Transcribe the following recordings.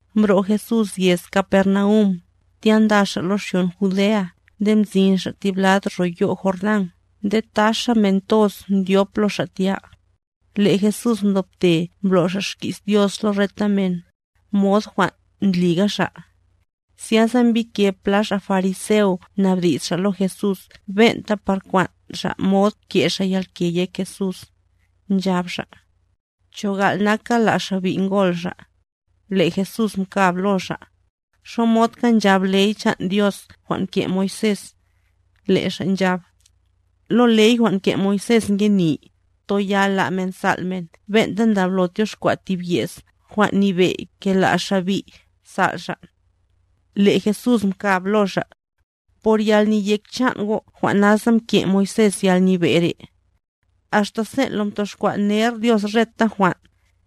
Mbro' Jesús yez Capernaum, tya nda xa' lo xyon Judea nde mzin xa' tib lad ro yo' Jordán nde taxa men toz mdyop lo Xa' tya. Le' Jesús mdobte mblo' Xa' xki's Dios lo reta men, mod jwan' ndliga Xa'. Zyasa mbike pla xa' fariseo mnabdi's xa' lo Jesús ben'ta par kwan' xa' mod ke' xa' yalke yek Jesús, nchab xa': —¿Cho gal' naka la' xa' bi' ngol xa'? Le' Jesús mkab lo xa': —¿Xomodka nchab ley chan' Dios jwan' mke' Moisés? Le' xa' nchab: —Lo ley jwan' mke' Moisés ngeni, toyal la' men sal' men ben'ta ndablo tyoxkwa' tib ye's jwan' nyebe' ke la' xa' bi' sal' xa'. Le' Jesús mkab lo xa': —Por yalneyek chan' go' jwan' nasa mke' Moisés yalnyebe' re'. Axta sen' mtoxkwa' ner Dios reta jwan',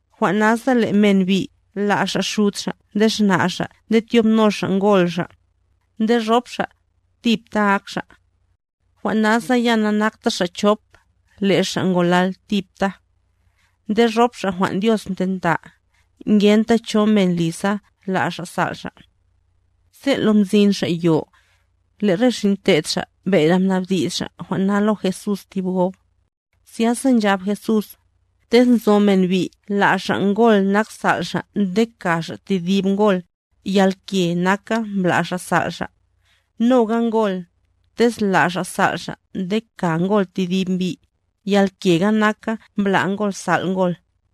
“Jwan' nasa le' men bi' la' xa' xud xa' nde xna' xa' nde tyobno xa' ngol xa', nde rop xa', tipta ak xa'.”b Jwan' nasa ya nanakta xa' chop, le' xa' ngolal tipta. Nde rop xa' jwan' Dios mtenta, ngenta cho men li sa la' xa' sal' xa'. Sen' lo mzin xa' yo, le' re xin' te'd Xa' bere mnabdi's xa' jwan' na lo Jesús ti gob. Zyasa nchab Jesús: —Tez nzo men bi' la' xa' ngol nak sal' xa' nde ka xa' tedib ngol, yalke naka mbla' xa' sal' xa'. Noga ngol, tez la' xa' sal' xa' nde ka ngol tedib mbi', yalkega naka mbla' ngol sal' ngol.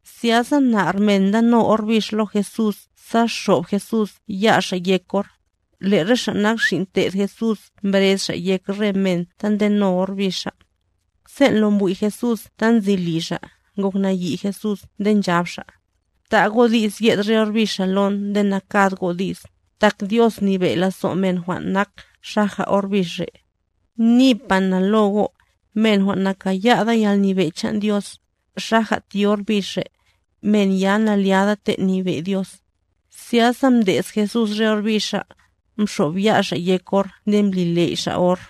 Zyasa nar men ndano or bix lo Jesús sa xob Jesús ya Xa' yek or;c le' re xa' nak xin' te'd Jesús mbrez xa' yek re men ta ndeno or bixa. Sen' lo mbwi' Jesús ta nzi li xa', ngok nayi' Jesús nde nchab Xa': —Bta' go' di's yed re or bixa lon nde nakad go' di's; tak Dios nyebe' lazo' men jwan' nak xaja or bix re'. Nipa na lo go', men jwan' nakaya'da yalnyebe' chan' Dios, xaja ti or bix re', men ya na'lyada lo yalnyebe' chan' Dios. Zyasa mde's Jesús re or bixa, mxob ya' Xa' yek or nde mbli ley' Xa' or.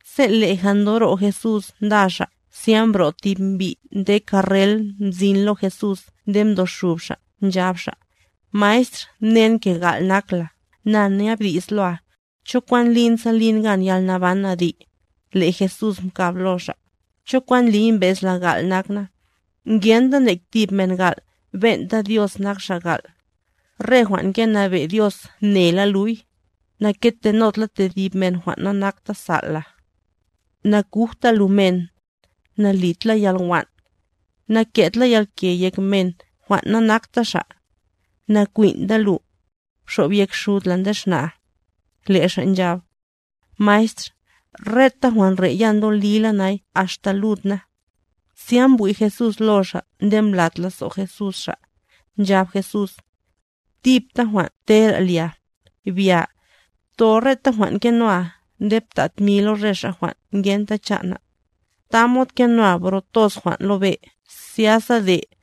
Sen' leja ndoro' Jesús nda xa', zya mbro' tib mbi' nde karrel mzin lo Jesús nde mdoxub xa', nchab xa': —Maestr mnen ke gal' nak la, na nyabdi's loa. ¿Cho kwan lin sa lin gan yalnaban adi'? Le' Jesús mkab lo xa': —¿Cho kwan ndliy mbez la gal' nak na? Ngenta nek tib men gal', ben'ta Dios nak Xa' gal'. Re jwan' ngenabe' Dios mnela luy: Na'ketenod la tedib men jwan' nanakta sal' la. Nakujta lu men. Nalid la yalwan'. Naket la yalke yek men jwan' nanakta xa'. Nakwin'ta lu. Bxob yek xud la nde xna'a. Le' xa' nchab: —Maestr, reta jwan' re' ya ndolila nay axta lud na. Zya mbwi' Jesús lo xa' nde mblat lazo' Jesús xa', nchab Jesús: —Tipta jwan' tera lia, bya, ptho reta jwan' ngenoa nde pta' tmi lo re xa' jwan' ngenta chan' na', tamod kenoa bro toz jwan' lo be' zyasa de',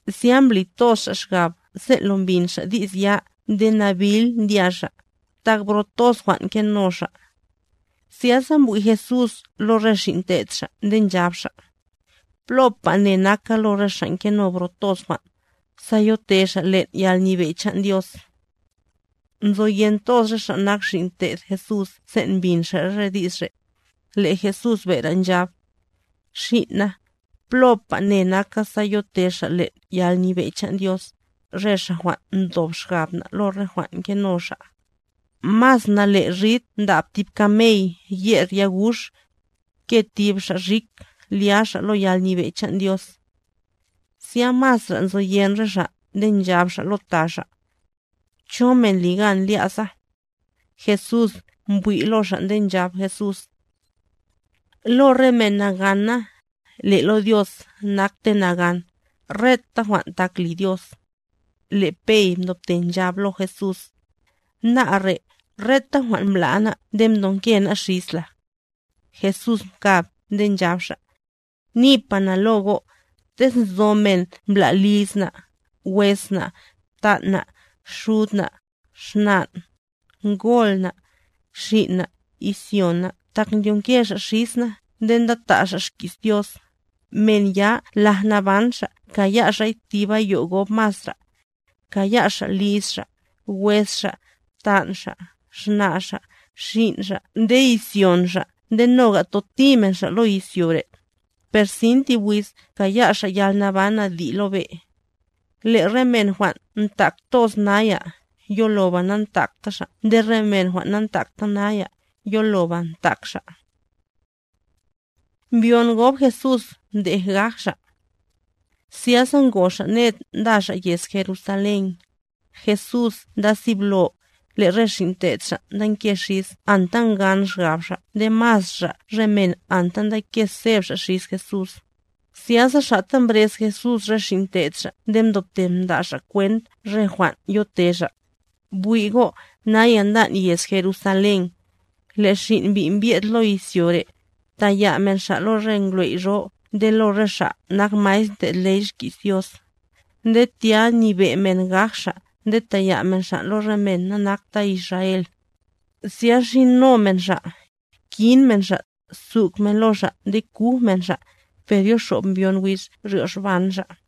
Zya mbli toz xa' xgab sen' lo mbin xa' di's ya nde nabil ndya xa', tak bro toz jwan' ngeno xa'. Zyasa mbwi' Jesús lo re xin' te'd Xa' nde nchab Xa': —Plopa ne naka lo re xa' ngeno bro toz jwan', sa yote xa' len' yalnyebe' chan' Dios. Nzoyen toz re xa' nak xin' te'd Jesús sen' mbin xa' re di's re'; le' Jesús bere nchab: —Xin' na, plopa ne naka, sa yote xa' len' yalnyebe' chan' Dios, re xa' jwan' ndob xgab na' lo re jwan' ngeno xa'. Mas nale' rid ndab tib kamey yer yagux, ke tib xa' rik lya xa' lo yalnyebe' chan' Dios. Zya masra' nzoyen re xa' nde nchab xa' lo ta xa': —¿Cho' men li gan lya' sa? Jesús mbwi' lo xa' nde nchab Jesús: —Lo re men nagana, le' lo Dios nakte nagan, reta jwan' tak li Dios. Le' Pey mdobte nchab lo Jesús: —Ná' re', reta jwan' mbla' ná' nde mdonke ná' xis la. Jesús mkab nde nchab xa': —Nipa na lo go', tez nzo men mbla' liz na', wes na', btan' na', xud na', xnan', ngol na', xin' na', izyon na' tak ndyonke xa' xis na nde ndata' xa' xki's Dios, men ya laj naban xa' kaya' xa'y tib ayo' gob masra'. Kaya' xa' liz xa', wes xa', btan' xa', xna' xa', xin' xa' nde izyon xa' nde noga toti men xa' lo izyo re'. Per sin tib wiz kaya' xa' yalnaban adi' lo be'. Le' re men jwan' ntak toz naya, yoloba nantakta xa' nde re men jwan' nantakta naya, yoloba ntak xa'. Mbyon gob Jesús mdej gaj Xa' Zyasa ngo xa' ned nda xa' yez Jerusalén. Jesús nda siblo, le' re xin' te'd Xa' ndanke xis anta ngan xgab xa' nde masra' re men anta ndake seb xa' xis Jesús. Zyasa xa'ta mbrez Jesús re xin' te'd Xa' nde ndobte mda' Xa' kwent re jwan' yote Xa': —Bwi' go' naya ndan' yez Jerusalén, le' Xin' Mbi' mbye'd lo izyo re', taya' men Xa' lo re ngwley' jwan' nyebe' nde lo re xa' nak maestr ndlo' ley xki's Dios, nde tya nyebe' men gaj Xa' nde taya' men Xa' lo re men nanakta Israel, zya xino men Xa', kin men Xa', suk men lo Xa' nde kuj men Xa'; per yoxob mbyon wiz ryoxban Xa'.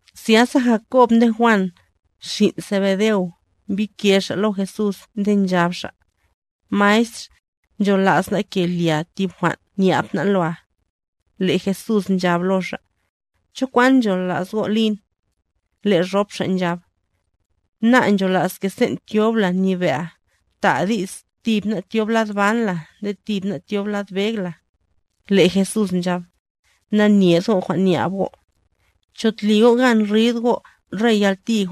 Zyasa Jakob nde Juan, xin' Zebedeo, mbike xa' lo Jesús nde nchab xa': —Maestr, nchola's ná' ke lia tib jwan' nyab ná' loa. Jesús nchab lo xa': —¿Cho kwan nchola's go' lin? Le' rop xa' nchab: —Ná' nchola's ke sen' tyob la nyebe'a, ta'a di's tib ná' tyob lad ban la nde tib ná' tyob lad beg la. Le' Jesús nchab: —Nanyed go' jwan' nyab go'. ¿Cho tli go' gan rid go' re yalti,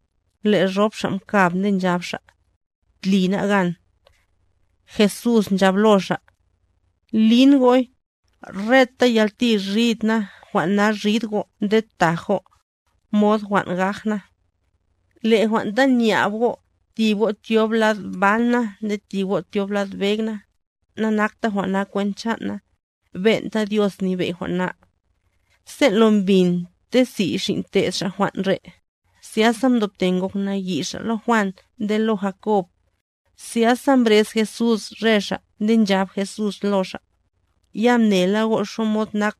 Le' rop xa' mkab nde nchab xa': —Tli ná' gan. Jesús nchab lo xa': —Lin go'y, reta yalti rid na jwan' na rid go' nde taj go', mod jwan' gaj na. Le' jwan' ta nyab go', tib go' tyob lad ban na nde tib go' tyob lad beg na, nakta jwan' na kwent chan' na, ben'ta Dios nyebe' jwan' na. Sen' lo mbin ti si' xin' te'd Xa' jwan' re', zya mdobte ngok nayi' xa' lo Juan nde lo Jakob. Zyasa mbrez Jesús re xa' nde nchab Jesús lo xa': —Ya mnela go' xamod nak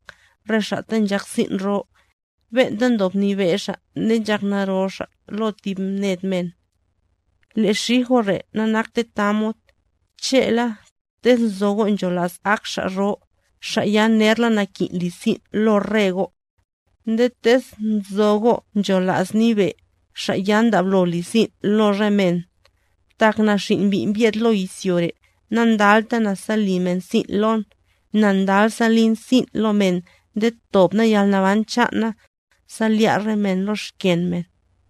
re xa' ta nchak sin' ro, ben'ta ndob nyebe' xa' nde nchak naro xa' lo tib ned men. Le' xij go' re' nanakte tamod; che'la, tez nzo go' nchola's ak xa' ro, xa' ya nerla nakin' li sin' lo re go'. Nde tez nzo go' nchola's nyebe', xa' ya ndablo li sin' lo re men. Tak na Xin' Mbi' mbye'd lo izyo re', nandalta na sa li men sin' lon, na ndal sa lin sin' lo men nde tob na yalnaban chan' na, sa lya' re men lo xken men.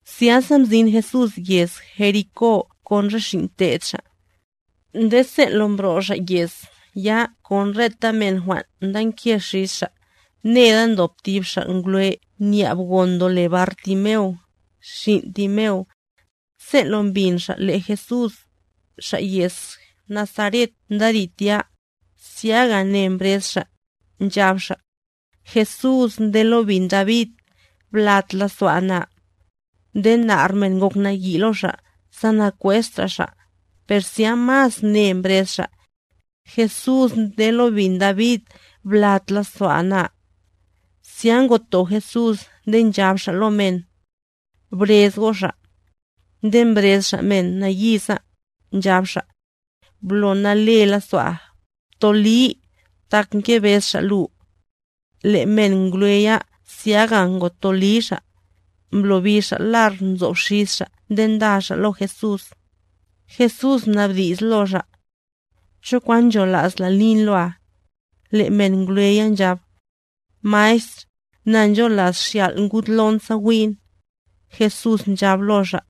Zyasa mzin Jesús yez Jericó kon re xin' te'd Xa'. Nde sen' lo mbro' xa' yez ya kon reta men jwan' ndanke xis xa', neda ndob tib xa' ngwlef nyab gon ndole Bartimeo, xin' Timeo. Sen' lo mbin xa' le' Jesús, Xa' yez Nazaret ndarid tya, zyaga ne mbrez xa', nchab xa': —Jesús nde lo bin David, blat lazo'a na. Nde nar men ngok nayi' lo xa' sa nakwesta xa', per zya mas ne mbrez xa': —¡Jesús nde lo bin David, blat lazo'a na! Zya ngoto Jesús nde nchab Xa' lo men: —Brez go' xa'. Nde mbrez xa' men nayiza, nchab xa': —¡Blo nale lazo'a, ptoli, tak ngebez Xa' lu! Le' men ngwle ya zyaga gotoli xa', mblobi xa' lar nzob xis xa' nde nda xa' lo Jesús. Jesús mnabdi's lo xa': —¿Cho kwan nchola's la lin loa? Le' men ngwle ya nchab: —Maestr, na ncholas xyal' ngud lon sa wi'n. Jesús nchab lo xa':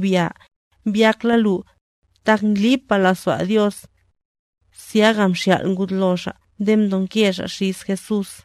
—Bya, mbyak la lu, tak ndlipa lazo'a Dios. Zyaga mxyal' ngud lo xa' nde mdonke xa' xis Jesús.